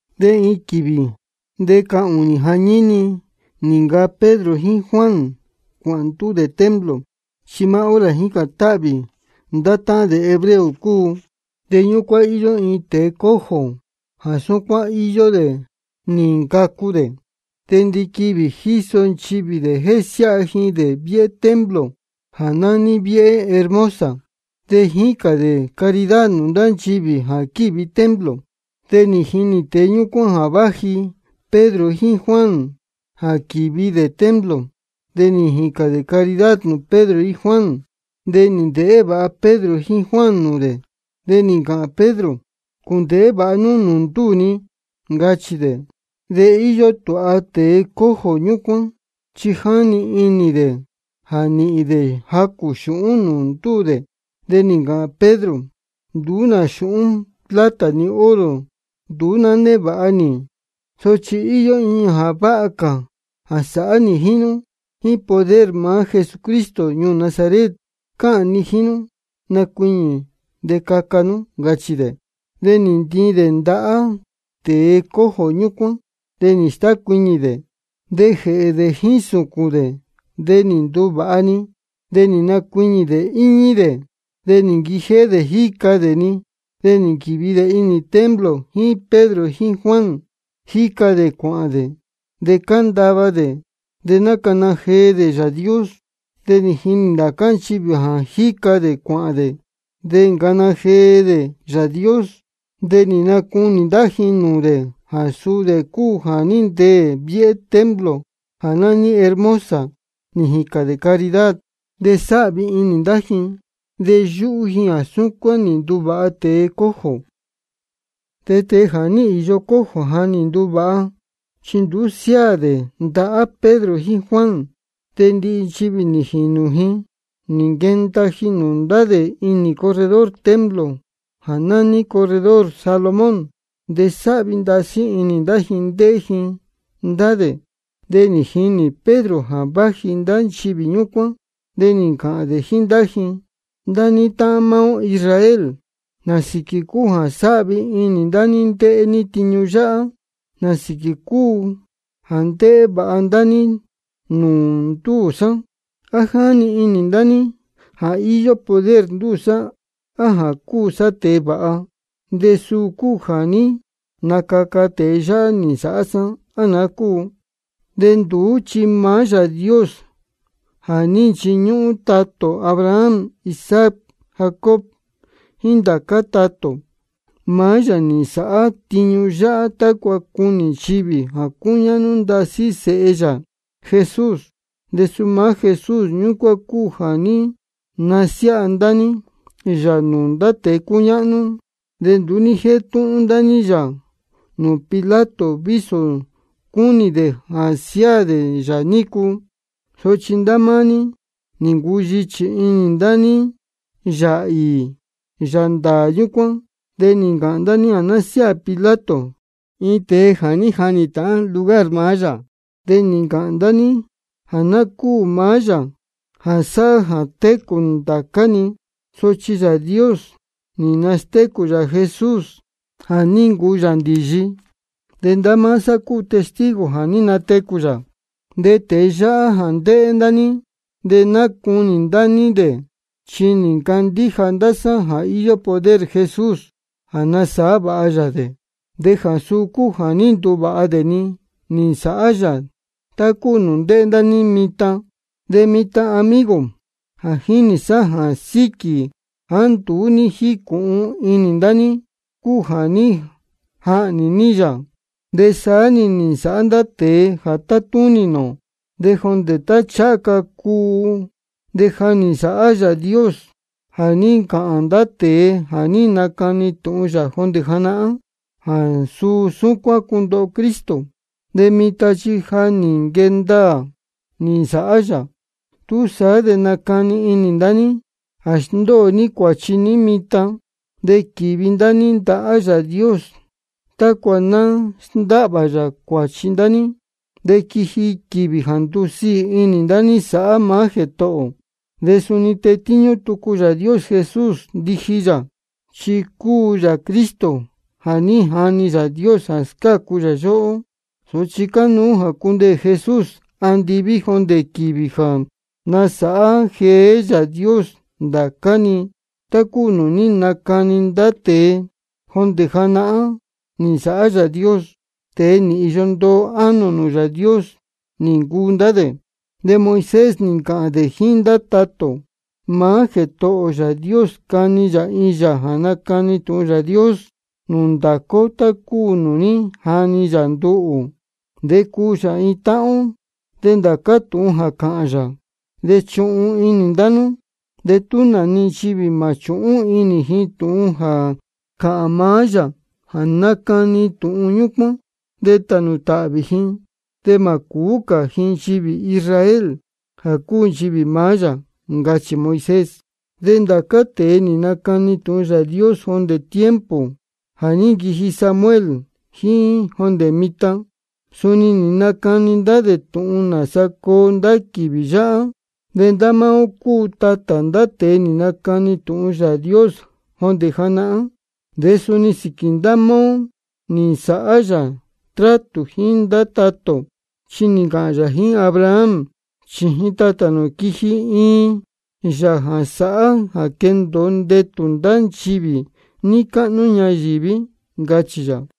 De iin quīvī de cahūnī jañíni nī ncaa Pedro jíín Juan cuāhān ndúū dē templo, chi maá hora jā jícān táhvī ndá táhán dē hebreo cúu. De ñúcuán íyó iin tēe cojo jā súcuán íyó dē nī ncacu dē. Chi ndiquivī jíso nchivī dē jésiáha ji dē viéhé templo jā nání Viéhé Hermosa, de jícān dē caridad nūū ndá nchivī jā quívi templo. De nī jinī tēe ñúcuán jā váji Pedro jíín Juan jā quīvi dē templo. De nī jīcān dē caridad nūū Pedro jíín Juan. De nī ndēhé vāha Pedro jíín Juan nūū dē, de nī ncāhān Pedro: Cūndēhé vāha nú nūū ndúū ni, ncachī dē. De íyó tūha tēe cojo ñúcuán, chi jáni inī dē jā nīhīn dē jacū xūhún nūū ndúū dē. De nī ncāhān Pedro: Nduú nā xūhún plata ni oro nduú ná névāha nī. Sochi íyó iin jā váha cā jā sāhá nī jíín nú. Jíín poder maá Jesucristo ñuū Nazaret cáhān ni jíín nú, nacuiñī de caca nú, ncachī dē. De nī ntiin dē ndahá cuáhá tēe cojo ñúcuán, de nī stácuiñī dē. De jēhē dē jíín sūcūn jéhē dē nī nduvāha-ni. De nīhin nī nacuiñī dē de íñí dē. De nī nquijéhé dē jíca dē-ni, de nī nquīvi dē inī templo jíín Pedro jíín Juan, jíca dē cuāhān dē, de cándava dē, de nácana jee dē Yāā Dios. De nī jinī ndācá nchivī jā jíca dē cuāhān dē, de nácana jee dē Yāā Dios. De nī nacunī ndá ji nūū dē jā suu dē cúu jā ní ndeē viéhé templo jā nání Viéhé Hermosa, nī jīcān dē caridad. De sáhvi inī ndá ji, de yúhú ji jā súcuán nī nduvāha tēe cojo. De tēe jā ní īyo cojo jā ní nduvāha, chi nduú siáā dē ndahá Pedro jíín Juan, de ndihi nchivī nī jinu ji nī nquenda ji nūū ndá dē inī corredor templo jā nání Corredor Salomón. De sáhvi ndasí inī ndá ji ndéhé ji ndá dē. De nī jinī Pedro jā váji ndá nchivī ñúcuán, de nī ncāhān dē jíín ndá ji: Ndá ní táhán maá ó Israel, ¿nā sīquī cúu jā sáhvi inī ndá ní ndéhé ní tiñu yáhá? ¿Nā sīquī cúu jā ndéhé vāha ndá ní nūū ndúū sá? ¿A jáni inī ndá ní jā íyó poder ndúū sá á jā cúu sá tēe vāha, de suu cúu jā ní nacaca tēe yáhá nī nsāhá sá, á naá cúu? De nduú chi maá Yāā Dios jā ní nchiñúhún tatā ō Abraham, Isaac, Jacob jíín ndá cā tatā ō, maá yā nī nsāhá tiñu yáhá tácua cunī nchivī jā cúñáhnú ndasí Sēhe yā Jesús. De suu maá Jesús ñúcuán cúu jā ní nasiáha ndá ní yā nūū ndá tēe cúñáhnú. De nduú ní jétúhún ndá ní yā nūū Pilato vísō cúnī dē jā siáā dē yā nícu. Sochi ndá máá ní nī ncuyichī inī ndá ní Yāā īī, Yāā ndāā ñúcuán. De nī ncāhān ndá ní jā ná siáā Pilato iin tēe jā ní jahnī ndīyi lugar maá yā. De nī ncāhān ndá ní jā ná cúū maá Yāā jā sáhá jā técū ndācá-ni. Sochi Yāā Dios nī nastécū yā Jesús jā ní ncuu yā ndīyi. De ndá máá sá cúu testigo jā ní natecū yā. De tēe yáhá jā ndéhé ndá ní de nácunī ndá ní dē, chi nī ncandíja ndá sá jā íyó poder Jesús jā nasāhá vāha yā dē, de jā suu cúu jā ní nduvāha dē-ni nī nsāhá yā tá cúu nūū ndéhé ndá ní mitan. De mitan amigo, ja jínī sá jā síquī jāá nduú ní jícūhun inī ndá ní cúu jā ní jahnī ní yā, de saá-ni nī nsāhá ndá tēe jā tátúnī nūū ō. De jondē tá ncháha ca cuu, de ja nī nsāhá Yāā Dios jā ní ncāhān ndá tēe jā ní nacani tūhun yā jondē janahán jā suu súcuán cundoho Cristo. De mitan chi ja nī nquee ndaā nī nsāhá yā. Túsaá de nacani inī ndá ní jā sndóo ní cuāchi ní mitan, de quīvi ndá ní ndahá Yāā Dios tácua ná sndáhvā yā cuāchi ndá ní, de quiji quīvī jā ndusiī inī ndá ní sāhá maá Jētohō ō. De suni tetíñú tucu Yāā Dios Jesús ndiji yā, chi cúu yā Cristo jā ní jani Yāā Dios jā scácu yā yóhó. Sochi cánuú jā cundeē Jesús andiví jondē quīvī jā nasāhá jeé Yāā Dios ndācá-ni tá cúu nūū ní nacani ndá tēe jondē janahán nī nsāhá Yāā Dios. De tēe nī īyo ndoo ánō nūū Yāā Dios nī ncuu ndá dē. De Moisés nī ncāhān dē jíín ndá tatā ō: Maá Jētohō ō Yāā Dios cani yā iin Yāā jā nacani tūhun Yāā Dios nūū ndācá ó tá cúu nūū ní jani yā nduhū. De cuu yā iin táhán ó. De ndācá tūhun jā cāhān yā, de chuhun inī ndá nú. De tú nā-ni nchivī mā chūhún inī ji tūhun jā cāhān maá Yāā jā nacani tūhun ñúcuán, de tānū tāhvī ji de mā cūú cā ji nchivī Israel, jā cúu nchivī maá yā, ncachī Moisés. De ndá cā tēe nī nacani tūhun Yāā Dios jondē tiempo jā ní nquiji Samuel jíín jondē mitan, suni nī nacani ndá dē tūhun nāsa coo ndá quīvī yáhá. De ndá máá ó cúu tatā ndá tēe nī nacani tūhun Yāā Dios jondē janahán. De suni sīquī ndá máá ó nī nsāhá yā trátū jíín ndá tatā ō, chi nī ncāhān yā jíín Abraham: Chījin tatā nū quiji iin Yāā jā sāhá jā quendōo ndetū ndá nchivī níí cáhnú ñayīví, ncachī yā.